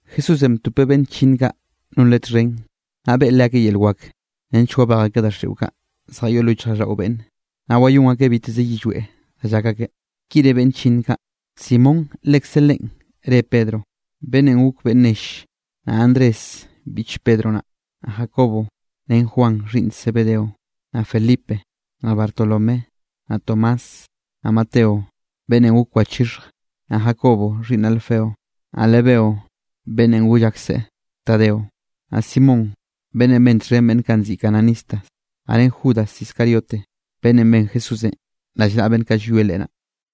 Jesúsenꞌ btopeꞌ beꞌnn chllinn kaꞌ non Leꞌe txhen, naꞌ beꞌe leakeꞌ yel wak nench wabej akeꞌ daxiꞌo zjayoꞌ lo yichjraꞌlldaꞌo beꞌnne, naꞌ wayón akeꞌ biteze yillweꞌ da llak akeꞌ. Ki re beꞌnn chllinn kaꞌ: Simón lekze leꞌen reꞌe Pedronꞌ, beꞌnnenꞌ gok beꞌnn nell, naꞌ Andrés biꞌch Pedro naꞌ, naꞌ Jacobo ren Juan xhiꞌnn Zebedeo, naꞌ Felipe, naꞌ Bartolomé, naꞌ Tomás, naꞌ Mateo beꞌnnenꞌ gok wachixhje, naꞌ Jacobo xhiꞌnn Alfeo, naꞌ Lebeo beꞌnnenꞌ goll akseꞌ Tadeo, naꞌ Simón beꞌnnenꞌ ben txhen beꞌnn kaꞌ nziꞌi cananistas, naꞌ ren Judas Iscariote beꞌnnenꞌ ben Jesúsenꞌ rallnaꞌa beꞌnn kaꞌ llwie Leꞌe naꞌ.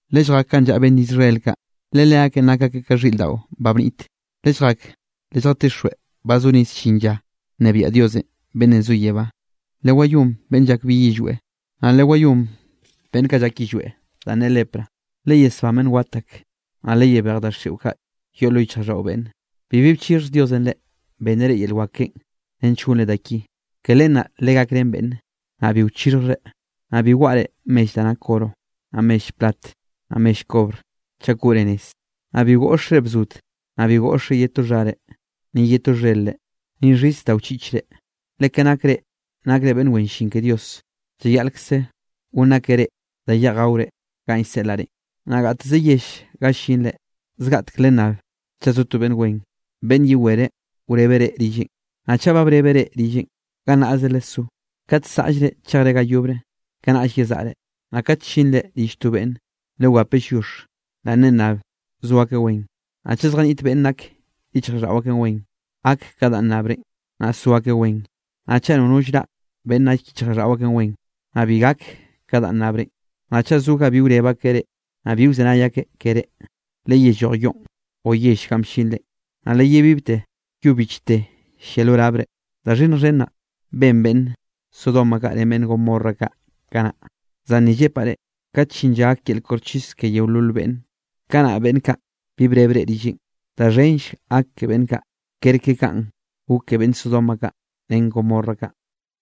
Lelljak ganꞌ llaꞌa beꞌnn Israel kaꞌ, le leakeꞌn nak akeꞌ ka xhiꞌr daꞌo ba bnit. Lelljak lelljatixjweꞌ ba zo rez llin lla nnebiaꞌ Dios beꞌnnenꞌ zo yebá. Lewayón beꞌnn llak bi yillweꞌ, naꞌ lewayón beꞌnn kaꞌ llak yillweꞌ danꞌ ne lepra, leyesbán beꞌnn wat ak, naꞌ leyebej daxiꞌo kaꞌ yoꞌ lo yichjraꞌlldaꞌo beꞌnne. Bibi bchixhj Diosenꞌ reꞌ, benneꞌ reꞌ yel wak keꞌen nench gonre da ki, ke len naꞌ legakrén beꞌnne, naꞌ bi wchixhjre. ’Naꞌ bi waꞌre mell da nak oro, naꞌ mell plat naꞌ mell kobr chak koꞌre nez. Naꞌ bi goꞌxre bzod, naꞌ bi goꞌxre ye to xhare, ni ye to xher-re, ni xhis da wchiꞌchre, le ka nak reꞌ nakre beꞌnn wen llin ke Dios, llayaꞌlkze gonn akeꞌ reꞌ da yeꞌj gaore, ganꞌ llseꞌlaꞌ reꞌn. ’Naꞌ gateze yell ga llinre, zgaꞌtek lennab chaꞌ zo to beꞌnn wen, beꞌnn yewere wrebe reꞌ rilleꞌn. Naꞌ chaꞌ ba brebeꞌ reꞌ rilleꞌn, gannaꞌze lesó. Kat saꞌllre chejre ga yobre, kanaꞌll yezaꞌre. Naꞌ kat llinre rill to beꞌnne, lewape lliox, naꞌ lennab so akeꞌ wen. Naꞌ chaꞌ zjaniꞌt beꞌnn nak yichjraꞌlldaꞌo akeꞌn wen, gak ka danꞌ nnabrenꞌ, naꞌ so akeꞌ wen. Naꞌ chaꞌ nono llraꞌ beꞌnn nak yichjraꞌlldaꞌo akeꞌn wen, naꞌ bi gak ka danꞌ nnabrenꞌ. Naꞌ chaꞌ zo ga bi wreb akeꞌ reꞌ, naꞌ bi wzenay akeꞌ keré, leyelloj yoꞌn o yell ganꞌ bllinre, naꞌ leyebibte yo bichte llia lo labre. Da xhinnj xhen naꞌ, ben beꞌnn Sodoma kaꞌ ren beꞌnn Gomorra kaꞌ kanaꞌ, zan ni llepaꞌ reꞌ, kat llin lla gak yel koxchis ke yeolol beꞌnne, kanaꞌ beꞌnn kaꞌ bi breb reꞌ rilleꞌn, da xhenll gak ke beꞌnn kaꞌ kerke kanꞌ gok ke beꞌnne Sodoma kaꞌ, ren Gomorra kaꞌ.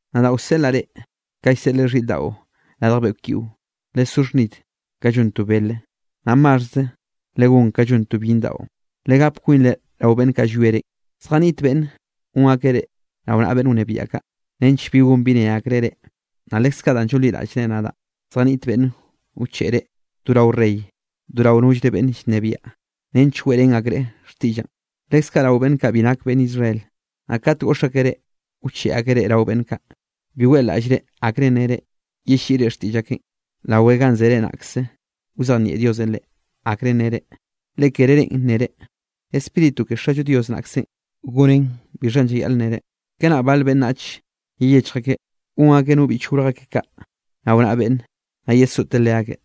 ’Nadaꞌ wseꞌlaꞌ reꞌ ka llseꞌleꞌ xhiꞌr daꞌo radj beꞌkw yiꞌo, lesó xhnid ka llon to bele, naꞌ maxhze legón ka llon to byinn daꞌo. Legap kwinre rao beꞌnn kaꞌ llwie reꞌn. Zjaniꞌt beꞌnn gon akeꞌ reꞌ rao naꞌa beꞌnn wnebiaꞌ kaꞌ, nench bi gon bi ne akreꞌ reꞌ. Naꞌ lekze kaꞌ danꞌ llonliraꞌllre nadaꞌ naꞌ, zjaniꞌt beꞌnn wcheꞌe reꞌ do rao rey, do rao nollre beꞌnn llnebiaꞌ nench weꞌrén akreꞌ xtiꞌllaꞌn, leskaꞌ rao beꞌnn kaꞌ bi nak beꞌnn Israel. Naꞌ kat goꞌx akeꞌ reꞌ, wcheꞌe akeꞌ reꞌ rao beꞌnn kaꞌ, bi weꞌlaꞌllre akre nnere yelliꞌre xtiꞌll akeꞌn. Rawe ganꞌ zere naꞌkze wzejnieꞌ Diosenꞌ reꞌ, akrenꞌ nnere. Le kere reꞌn nnere, Spíritu ke Xallo Dios naꞌkzenꞌ gonnen bixhanꞌ llayaꞌl nnere. ’Kanaꞌ bale beꞌnnache, yeyechj akeꞌ gon akeꞌ no biꞌch gorj akeꞌ rao naꞌa beꞌnne, naꞌ yesoꞌte leakeꞌ,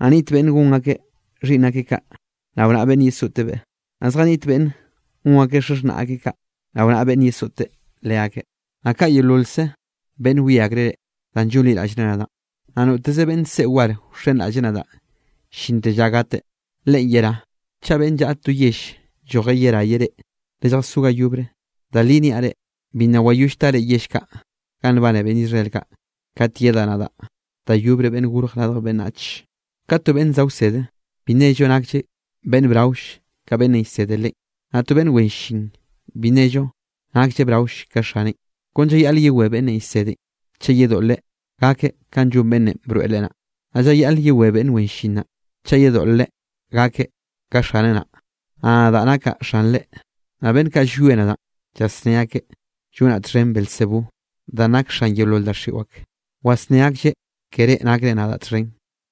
naꞌ niꞌt beꞌnn gon akeꞌ xhiꞌnn akeꞌ kaꞌ, rao naꞌa beꞌnn yesoꞌtebeꞌ, naꞌ zjaniꞌt beꞌnne gon akeꞌ xaxhnaꞌ akeꞌ kaꞌ, rao naꞌa beꞌnne yesoꞌte leakeꞌ. Naꞌ ka yeololze beꞌnn wie akreꞌ reꞌ, danꞌ llonliraꞌllre nadaꞌ, naꞌ noteze beꞌnn se war wxenraꞌlleꞌ nadaꞌ llinte lla gateꞌ, leꞌen yerá. Chaꞌ beꞌnn llaꞌa to yell lloje yeraye reꞌ, lelljazó ga yobre. Da li niaꞌ reꞌ, bi nna wayoll tare yell kaꞌ ganꞌ nbane beꞌnn Israel kaꞌ, kat yedaꞌ nadaꞌ da yobre Beꞌnn Gorj Radj Beꞌnnach. ’Kat to beꞌnn za wsede, bi nello naklleꞌ beꞌnn braoll ka beꞌnnenꞌ llsede leꞌen, naꞌ to beꞌnn wen llin bi nello naklleꞌ braoll ka xaneꞌn. Kon llayaꞌle yewé beꞌnnenꞌ llsedenꞌ, chaꞌ yedoꞌlreꞌ gakeꞌ kanꞌ llon beꞌnnenꞌ broeꞌ leꞌe naꞌ, naꞌ llayaꞌle yewé beꞌnn wen llin naꞌ, chaꞌ yedoꞌlreꞌ gakeꞌ ka xaneꞌ naꞌ. Naꞌ nadaꞌ nakaꞌ xanre, naꞌ beꞌnn kaꞌ llwie nadaꞌn, llasné akeꞌ llonaꞌ txhen Beelzebú, danꞌ nak xan yeolol daxiꞌo ak, wasné aklleꞌ ke reꞌ nakre nadaꞌ txhen.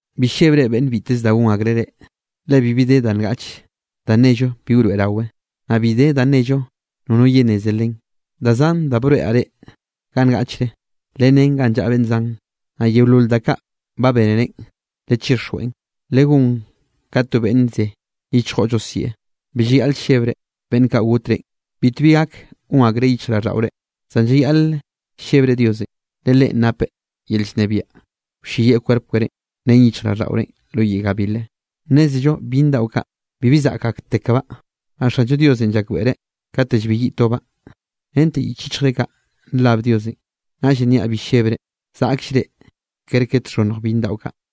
’Bi llebre beꞌnn biteze da gon akreꞌ reꞌ, le bibi de da ngaꞌche da nello bi wroeꞌrawe, naꞌ bi de da nello nono yenneze len. Da zan da broeꞌraꞌ reꞌ ganꞌ ngaꞌchre, lennén ganꞌ llaꞌa beꞌnn zan. Naꞌ yeolol da kaꞌ ba bénerenꞌ, lechixjweꞌn, legón ka to beꞌnn ze yichjo llosieꞌ. Bi llayaꞌle llebre beꞌnn kaꞌ got reꞌn. Bitbi gak gon akreꞌ yichjraꞌlldaꞌore. Zan llayaꞌle llebre Diosenꞌ, le Leꞌen napeꞌ yel llnebiaꞌ, wlleyieꞌ kwerp kerénꞌ ren yichjraꞌlldaꞌorenꞌ lo yiꞌ gabilenꞌ. ’Nnézello byinn daꞌo kaꞌ bibi zaꞌk aktekbaꞌ, naꞌ Xallo Diosenꞌ llakbeꞌreꞌ kate llbeyiꞌ tobaꞌ. Rente yich yichjre kaꞌ nrab Diosenꞌ. Naꞌllenꞌ niaꞌ bi llebre, zaꞌkll reꞌ kerke txhonnj byinn daꞌo kaꞌ.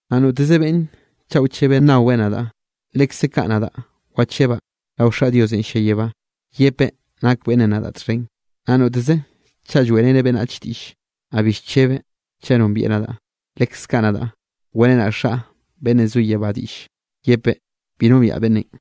’Naꞌ noteze beꞌnne chaꞌ wchebeꞌ nnaweꞌ nadaꞌ, lekze kaꞌ nadaꞌ wachebaꞌ rao Xaꞌ Diosenꞌ llia yebá, yepeꞌ nak beꞌnnenꞌ nadaꞌ txhen. Naꞌ notezeꞌ chaꞌ lloeꞌreneꞌ beꞌnnach diꞌll, naꞌ bi llchebeꞌ chaꞌ nombieꞌ nadaꞌ, lekze kaꞌ nadaꞌ weꞌrenaꞌ Xaꞌ beꞌnn zo yebá diꞌll, yepeꞌ bi nombiaꞌ beꞌnnenꞌ.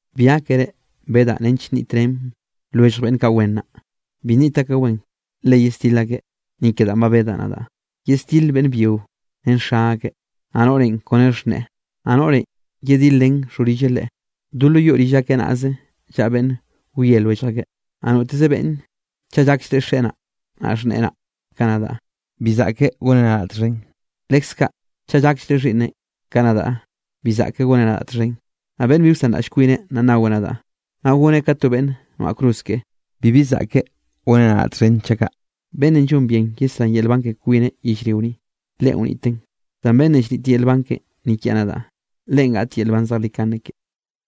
’Bi gákere bedaꞌ nench nniꞌt ren lwellj beꞌnn kaꞌ wen naꞌ. Bi nniꞌt akeꞌ wen, le yesdil akeꞌ. Ni ke danꞌ ba bedaꞌ naꞌ, yesdile beꞌnn byio ren xa akeꞌ, naꞌ noꞌrenꞌ kone xhneꞌe, naꞌ noꞌrenꞌ yedil ren xhorille leꞌe. Do lo yoꞌ rill akeꞌ naꞌze llaꞌa beꞌnn wie lwellj akeꞌ. ’Naꞌ noteze beꞌnne chaꞌ llakllreꞌ xeꞌe naꞌ xhneꞌen ka nadaꞌ, bi saꞌkeꞌ goneꞌ nadaꞌ txhen. Leskaꞌ chaꞌ llakllreꞌ xhiꞌnneꞌ, ka nadaꞌ bi saꞌkeꞌ goneꞌ nadaꞌ txhen. Naꞌ beꞌnn bi wsanraꞌll kwineꞌ naꞌ naweꞌ nadaꞌ, naꞌ goneꞌ ka to beꞌnn noaꞌ cruz keꞌe, bibi zaꞌkeꞌ goneꞌ nadaꞌ txhen chaꞌ kaꞌ. Beꞌnnenꞌ llon bien yesrá yel nban ke kwineꞌ yellrio ni, leꞌen wniteꞌn, zan beꞌnnenꞌ llnit yel nban keꞌen ni kiaꞌ nadaꞌ, leꞌen gaꞌt yel nban zejlikane keꞌe.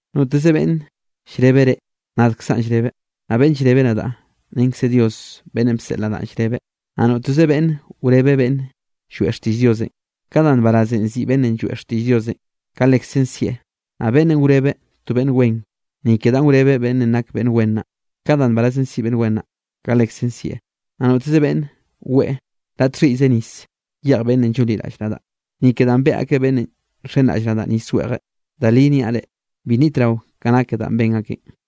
’Noteze beꞌnn llrebe reꞌ nadkzaꞌn llrebeꞌ, naꞌ beꞌnn llreb nadaꞌ renkze Dios beꞌnnenꞌ bseꞌl nadaꞌn llrebeꞌ. Naꞌ noteze beꞌnne wrebeꞌ beꞌnn lloeꞌ xtiꞌll Diosenꞌ, ka da nbarazenꞌ siꞌi beꞌnnenꞌ lloeꞌ xtiꞌll Diosenꞌ, kaꞌ lekzen sieꞌ. Naꞌ beꞌnnenꞌ wrebe to beꞌnn wen, ni ke danꞌ wrebeꞌ beꞌnnenꞌ nak beꞌnn wen naꞌ, ka danꞌ nbarazenꞌ siꞌi beꞌnn wen naꞌ, kaꞌ lekzen sieꞌ. Naꞌ noteze beꞌnne weꞌe la txhiꞌyze nis yeꞌj beꞌnn llonliraꞌll nadaꞌ, ni ke danꞌ beꞌe akeꞌ beꞌnnenꞌ nxenraꞌll nadaꞌ nis weꞌjeꞌ, da li niaꞌ reꞌ, bi nnitrao ka nake danꞌ ben akeꞌn.